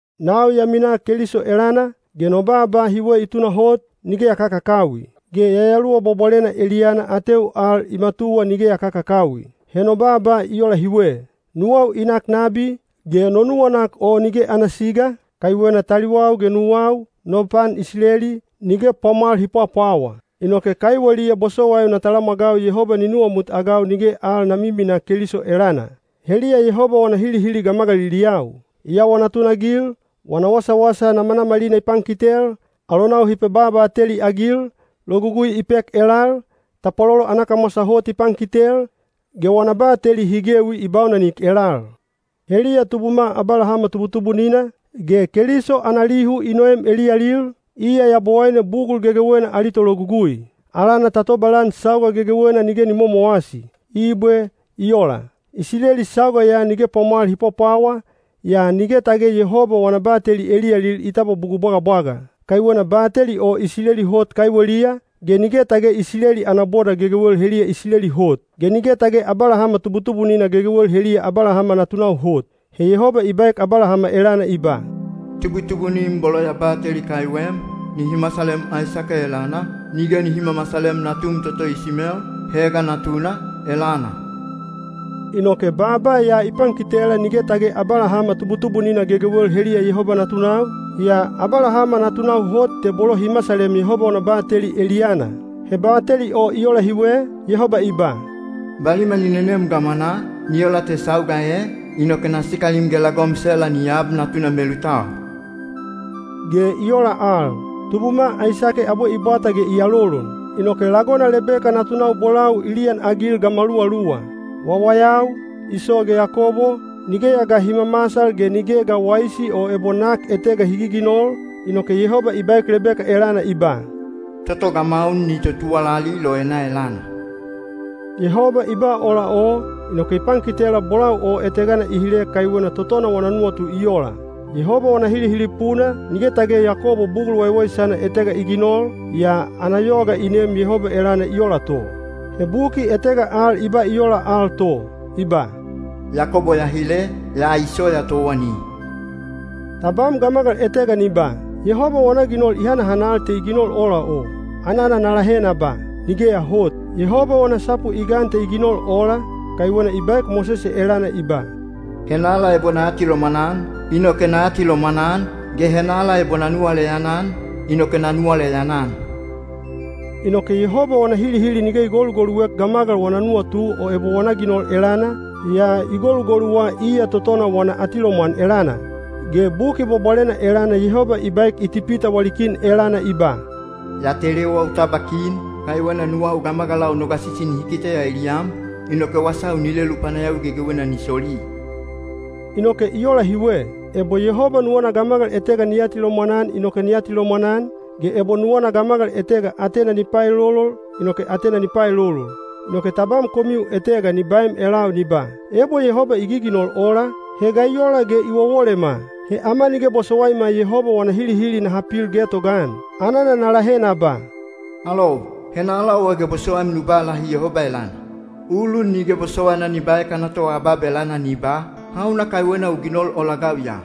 Nau ya minaa Keliso elana, ge no baaba hiwe i tunahot, nige ya kakakawi. Ge Yayaluwa Bwabwalena eliyana ateu al i matuwa nige ya kakakawi. He no baaba i ola hiwe: nuwau i nak nabi, ge no nuwanak o nige ana siga, kaiwena taliwau ge nuwau, no pan Isileli, nige pwamwal hi pwapwawa. Inoke kaiweliya bosowaiu na talamwagau Yehoba ni nuwamutagau nige al na miminaa Keliso elana. Heliya Yehoba wana hilihili gamagaliliyau. I awa natunagil, wana wasawasa namanamalina i pankitel, alonau hi pebabateli-agil, Logugui i pek elal, tapwalolo ana kamwasa hot i pankitel, ge wana bateli hi gewi i baunanik elal. Heliya tubuma Abalahama tubutubunina, ge Keliso ana lihu i noem eliyalil, iya Yabowaine bugul gegewena ali Tologugui. Alana ta tobalan sauga gegewena nige ni momowasi. Ibwe. I ola. Isileli sauga ya nige pwamwal hi pwapwawa, yaa nige tage Yehoba wana bateli eliyalil i tabwa bugul bwagabwaga. Kaiwena bateli o Isileli hot kaiweliya, ge nige tage Isileli ana boda gegewel heliya Isileli hot. Ge nige tage Abalahama tubutubunina gegewel heliya Abalahama natunau hot. He Yehoba i baek Abalahama elana i ba, “Tubutubunim bolo ya bateli kaiwem, nihi masalem Aisake elana, nige nihi mamasalem natum toto Isimel, Hega natuna, elana.” Inoke baaba ya i pankitela nige tage Abalahama tubutubunina gegewel heliya Yehoba natunau, yaa Abalahama natunau hot te bolo hi masalem Yehoba wana bateli eliyana. He bateli o i ola hiwe, Yehoba i ba: “Baliman i nenem gamwanaa, ni ola te sauga e, na sikalim, yaka lagom Sela ni ab natuna melutau.” Ge i ola al, tubuma Aisake abwe i bwata ge i alolon. Inoke lagona Lebeka natunau bolau i liyanagil gamaluwaluwa. Wawayau, Iso ge Yakobo, nigeya ga hi mamasal ge nige ga waisi o ebo nak etega hi giginol, inoke Yehoba i baek Lebeka elana i ba, “Toto gamaun ni totuwalali loena elana.” Yehoba i ba ola o, inoke i pankitela bolau o etegana i hile kaiwena totona wana nuwatu i ola. Yehoba wana hilihili puna, nige tage Yakobo bugul waiwaisana etega i ginol, yaa ana yoga i neem Yehoba elana i ola to. He buki etega al i ba i ola al to, i ba, “Yakobo ya hile, yaa Iso ya towani.” Tabam gamagal etega ni ba, “Yehoba wana ginol i hanahanal te i ginol ola o.” Anana na lahe na ba, “Nigeya hot!” Yehoba wana sapu i gan te i ginol ola, kaiwena i baek Mosese elana i ba, “Henala ebo na atilomwan-an, inoke na atilomwan-an, ge henala ebo na nuwaleyan-an, inoke na nuwaleyan-an.” Inoke Yehoba wana hilihili nige i golugoluek gamagal wana nuwatu o ebo wana ginol elana, yaa i golugoluwa iya totona wana atilomwan elana. Ge Buki Bwabwalena elana Yehoba i baek Itipita wali kin elana i ba, “Ya telewa u tabwa kin, kaiwena nuwau gamagalau no gasisi nihi kiteya eliyam, inoke wasau ni lelu panayawi gegewena ni soli.” Inoke i ola hiwe: ebo Yehoba nuwana gamagal etega ni atilomwan-an inoke ni atilomwan-an, ge ebo nuwana gamagal etega atena ni paelolol, inoke atena ni paelolol. Inoke tabam komiu etega ni baem elau ni ba, “Ebo Yehoba i giginol ola, he ga i ola ge i wowolema? He ama nige bosowaima Yehoba wana hilihili naha pil getogaan.” Anana na lahe na ba, “Alou, henala owa ge bosowaim nu ba lahi Yehoba elana? Ulun nige bosowaina ni baek ana toabab elana ni ba, ‘Hauna kaiwena u ginol ola-agau ya?’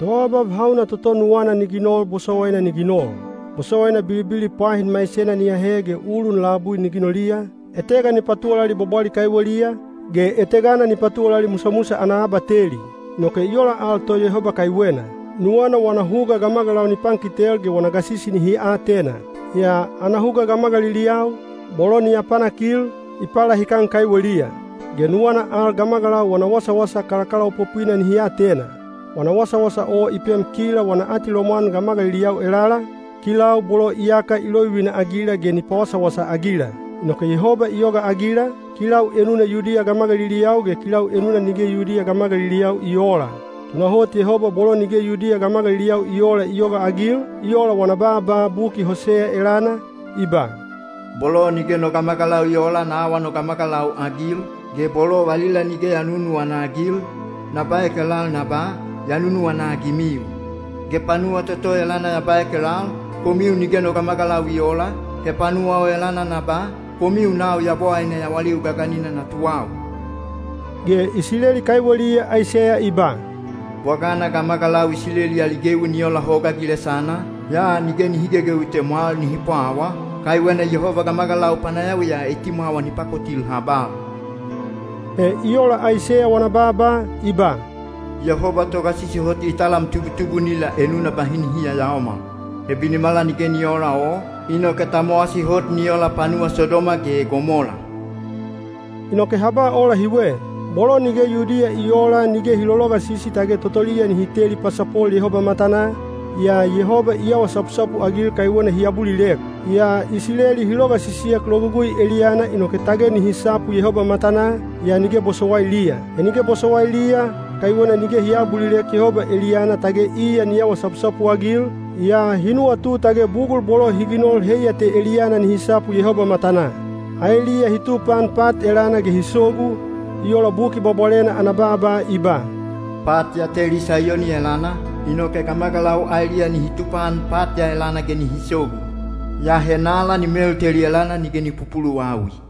Toabab hauna toto nuwana ni ginol bosowaina ni ginol. Bosowaina bilibili pwahin maisena ni ahe ge ulun labui ni ginoliya, etega ni patuwalali bwabwali kaiweliya, ge etegana ni patuwalali musamusa ana abateli.” Inoke i ola al to Yehoba kaiwena. Nuwana wana huga gamagalau ni pankitel ge wana gasisi nihi atena. (Yaa ana huga gamagaliliyau, bolo ni apanakil, i palahikan kaiweliya.) Ge nuwana al gamagalau wana wasawasa kalakalaopopwina nihi atena. Wana wasawasa o i pem kila wana atilomwan gamagaliliyau elala, kilau bolo iyaka i lovivina-agila ge ni pawasawasa-agila. Inoke Yehoba i yogaagila, kilau enuna Yudiya gamagaliliyau ge kilau enuna nige Yudiya gamagaliliyau i oola. Tunahot Yehoba bolo nige Yudiya gamagaliliyau i oola i yogaagil, i ola wana baaba buki Hoseya elana, i ba: Bolo nige no gamagalau i oola na awa no gamagalau-agil, ge bolo valila nige ya nunuwana-agil, na baek elal na ba, “Ya nunuwana-agimiu.” Ge panuwa toto elana ya baek elal, “Komiu nige no gamagalau i oola,” he panuwa o elana na ba, “Komiu nau Yabowaine yawaliu gaganina natuwau.” Ge Isileli kaiweliya Aiseya i ba, “Bwagana gamagalau Isileli ali gewi ni ola hoga gilesana, yaa nige nihi gegewi te mwal nihi pwawa, kaiwena Yehoba gamagalau panayawiya etimwawa ni pakotil habal.” He i ola Aiseya wana baaba, i ba, “Yehoba Togasisi Hot i talam tubutubunila enuna bahi nihi yayaomal. He binimala nige ni oola o, inoke ta mowasi hot ni ola panuwa Sodoma ge Gomola.” Inoke ha ba ola hiwe. Bolo nige Yudiya i oola nige hi lologasisi tage totoliya nihi teli pasapol Yehoba matanaa, yaa Yehoba i awa sapusapu-agil kaiwena hi abulilek. Yaa Isileli hi logasisiek Logugui eliyana inoke tage nihi sapu Yehoba matanaa, yaa nige bosowailiya. He nige bosowailiya, kaiwena nige hi aabulilek Yehoba eliyana tage iya ni awa sapusapu-agil, yaa hi nuwatu tage bugul bolo hi ginol heiya te eliyana nihi sapu Yehoba matanaa. Aeliya hi tupaan pat elana ge hi sogu, i ola Buki Bwabwalena ana baaba i ba, “Pat ya teli Saiyoni elana, inoke gamagalau aeliya nihi tupaan pat ya elana ge nihi sogu. Yaa henala ni melteli elana nige ni pupuluwawi.”